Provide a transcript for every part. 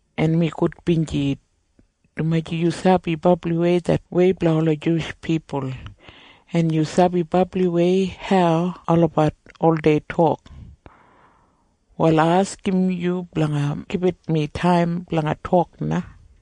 en mi gudbinji, dumaji yu sabi brabliwei det wei blanga ola Juwish pipul, en yu sabi brabliwei hau olabat oldei tok. Wal ai askim yu blanga gibit mi taim blanga tok na.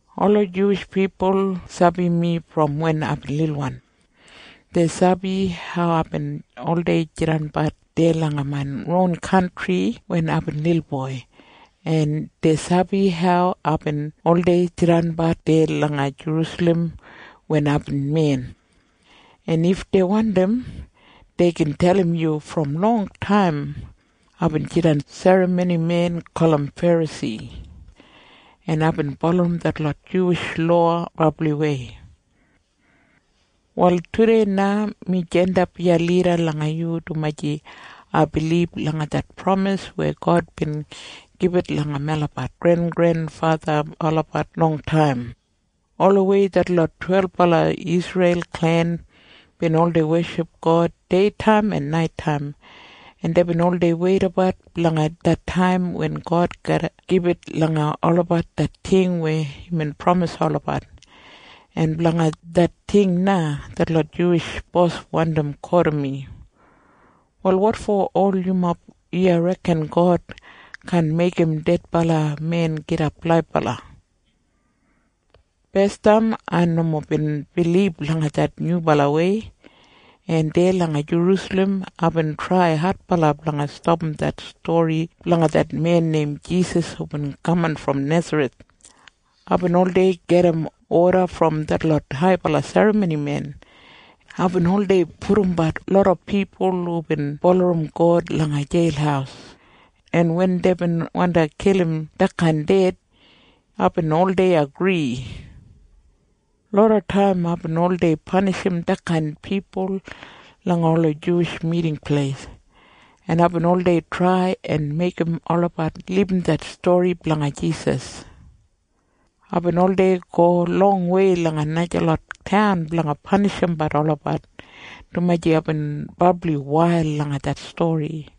“Ola Juwish pipul sabi mi brom wen aibin lilwan. Dei sabi hau aibin oldei jidanbat deya langa main ron kantri wen aibin lilboi, en dei sabi hau aibin oldei jidanbat deya langa Jerusalem wen aibin men, en if dei wandim, dei gin dalim yu brom longtaim aibin jidan serramonimen gulum Ferasi, en aibin bulurrum detlot Juwish lowa brabliwei. “Wal tudei na mi jandap iya lida langa yu dumaji ai bilib langa det pramis weya God bin gibit langa melabat grengrenfatha olabat longtaim. Olawei detlot twelbala Isreil klen bin oldei weship God deitaim en naitaim, en deibin oldei weidabat blanga det taim wen God garra gibit langa olabat det ting weya imbin pramisim olabat, en blanga det ting na detlot Juwish bos wandi kotim mi. Wal wotfo ol yumob iya reken God kaan meigim dedbala men gidap laibala? “Basdam ai nomo bin bilib langa det nyubalawei, en deya langa Jerusalem aibin trai adbala blanga stapam det stori blanga det men neim Jisas hubin kaman brom Nesareth. Aibin oldei gedim oda brom detlot haibala serramonimen, en aibin oldei pudumbat loda pipul hubin bulurrum God langa jeil, en wen deibin wandi kilim detkain ded, aibin oldei agri. Lodataim aibin oldei panishim detkain pipul langa ola Juwish Miting Pleis, en aibin oldei trai en meigim olabat libum det stori blanga Jisas. Aibin oldei go longwei langa najalot taun blanga panishimbat olabat, dumaji aibin brabli wail langa det stori.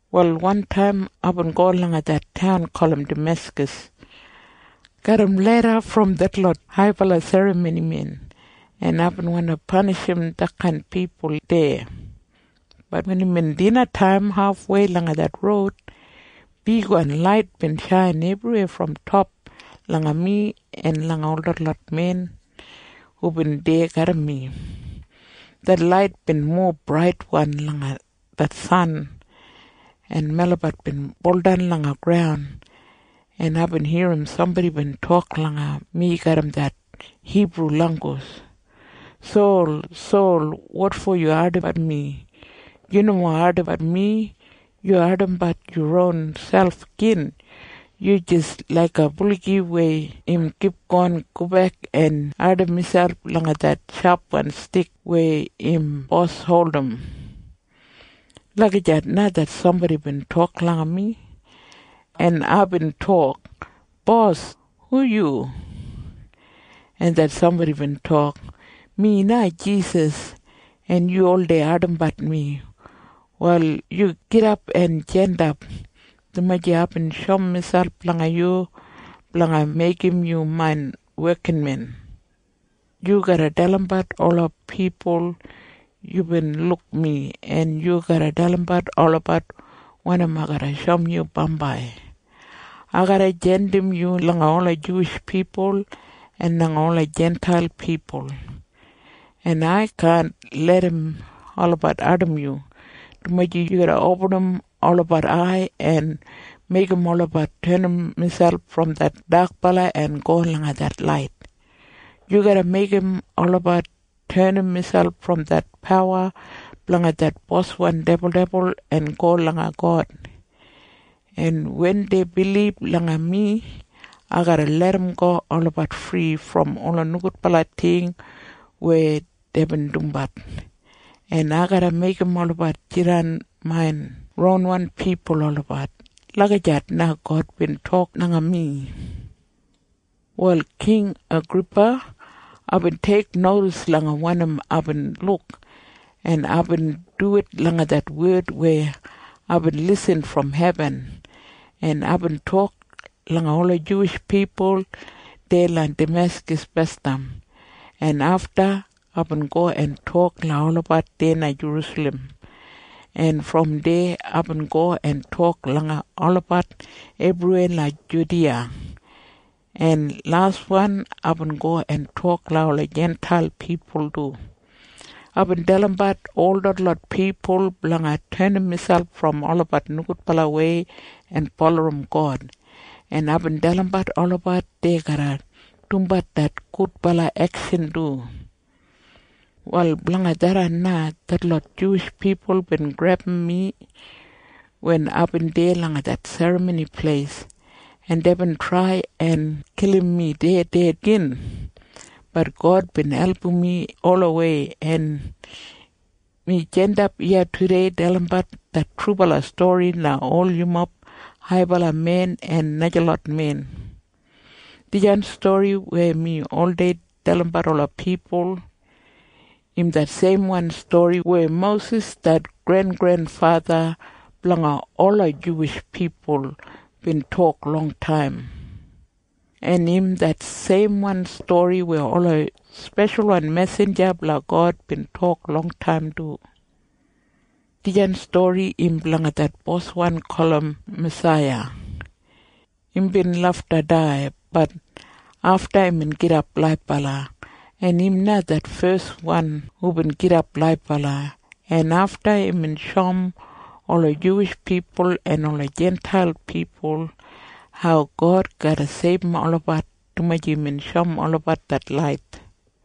“Wal wantaim aibin go langa det taun gulum Dameskas garram leda brom detlot haibala serramonimen, en aibin wandi panishim detkain pipul deya. Bat wen imbin dinataim hafwei langa det roud, bigwan lait bin shain ebriwei brom top langa mi en langa ol detlot men hubin deya garram mi. Det lait bin mowa braitwan langa det san, en melabat bin buldan langa graun, en aibin irrim sambodi bin tok langa mi garram det Hibru langgus. ‘Sol, Sol, wotfo yu ardimbat mi? Yu nomo ardimbat mi. Yu ardimbat yu ronselp gin. Yu jis laiga buligi weya im kipgon gobek en ardim miselp langa det shapwan stik weya im bos holdim.’ Lagijat na det sambodi bin tok langa mi. En aibin tok, ‘Bos, hu yu?’ En det sambodi bin tok, ‘Mi na Jisas, en yu oldei ardimbat mi. Wal yu gidap en jandap, dumaji aibin shoum miselp langa yu blanga meigim yu main wekinmen. Yu garra dalimbat ola pipul yubin luk mi, en yu garra dalimbat olabat wanim ai garra shoum yu bambai. Ai garra jandim yu langa ola Juwish pipul en langa ola Jintail pipul, en ai kaan larram olabat ardimbat yu, dumaji yu garra opinim olabat ai en meigim olabat tenim miselp brom det dakbala en go langa det lait. Yu garra meigim olabat tenim miselp brom det pawa blanga det boswan dibuldibul en go langa God, en wen dei bilib langa mi, ai garra larramgo olabat fri brom ola nogudbala ting weya deibin dumbat, en ai garra meigim olabat jidan main ronwan pipul olabat.’ Lagijat na God bin tok langa mi. “Wal King Agripa, aibin teiknodis langa wanim aibin luk, en aibin duwit langa det wed weya aibin lisin brom hebin, en aibin tok langa ola Juwish pipul deya langa Dameskas basdam, en afta aibin go en tok langa olabat deya langa Jerusalem, en brom deya aibin go en tok langa olabat ebriweya langa Judiya, en laswan aibin go en tok langa ola Jintail pipul du. Aibin dalimbat ol detlot pipul blanga tenim miselp brom olabat nogudbalawei en bulurrum God, en aibin dalimbat olabat dei garra dumbat det gudbala ekshan du. “Wal blanga tharran na detlot Juwish pipul bin grebum mi wen aibin deya langa det Serramoni Pleis, en deibin trai en kilim mi ded deya gin. Bat God bin album mi olawei, en mi jandapbat iya tudei dalimbat det trubala stori langa ol yumob haibala men en najalot men. Dijan stori weya mi oldei dalimbat ola pipul, im det seimwan stori weya Mosis det grengrenfatha blanga ola Juwish pipul bin tok longtaim, en im det seimwan stori weya ola speshalwan mesinja blanga God bin tok longtaim du. Dijan stori im blanga det Boswan gulum Masaiya. Imbin lafta dai. Bat afta, imbin gidap laibala, en im na det feswan hubin gidap laibala brom dedbala. En afta imbin shoum ola Juwish pipul en ola Jintail pipul hau God garra seibum olabat, dumaji imbin shoum olabat det lait.”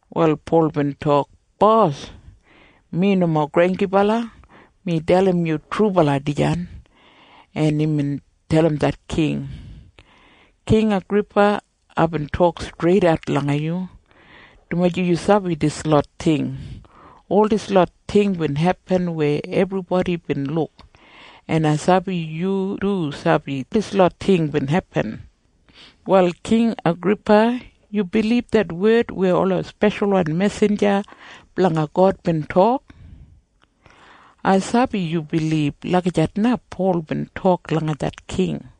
Wal Pol bin tok, “Bos, mi nomo granggibala. Mi dalim yu trubala dijan.” En imbin dalim det king, “King Agripa, aibin tok streidat langa yu, dumaji yu sabi dislot ting. Ol dislot ting bin hepin weya ebribodi bin luk, en ai sabi yu du sabi dislot ting bin hepin. Wal King Agripa, yu bilib det wed weya ola speshalwan mesinja blanga God bin tok? Ai sabi yu bilib.” Lagijat na Pol bin tok langa det king.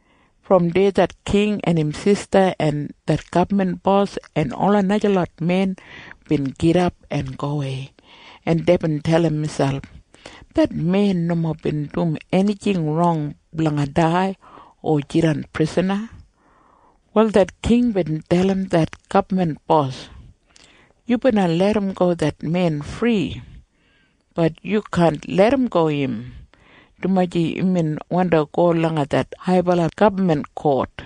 Brom deya det king en im sista en det gabman bos en ola najalot men bin gidap en gowei, en deibin dalim miselp, “Det men nomo bin dum enijing rong blanga dai o jidan prisana.” Wal det king bin dalim det gabman bos, “Yu bina larramgo det men fri. Bat yu kaan larramgo im, dumaji imbin wandi go langa det haibala gabman kot.”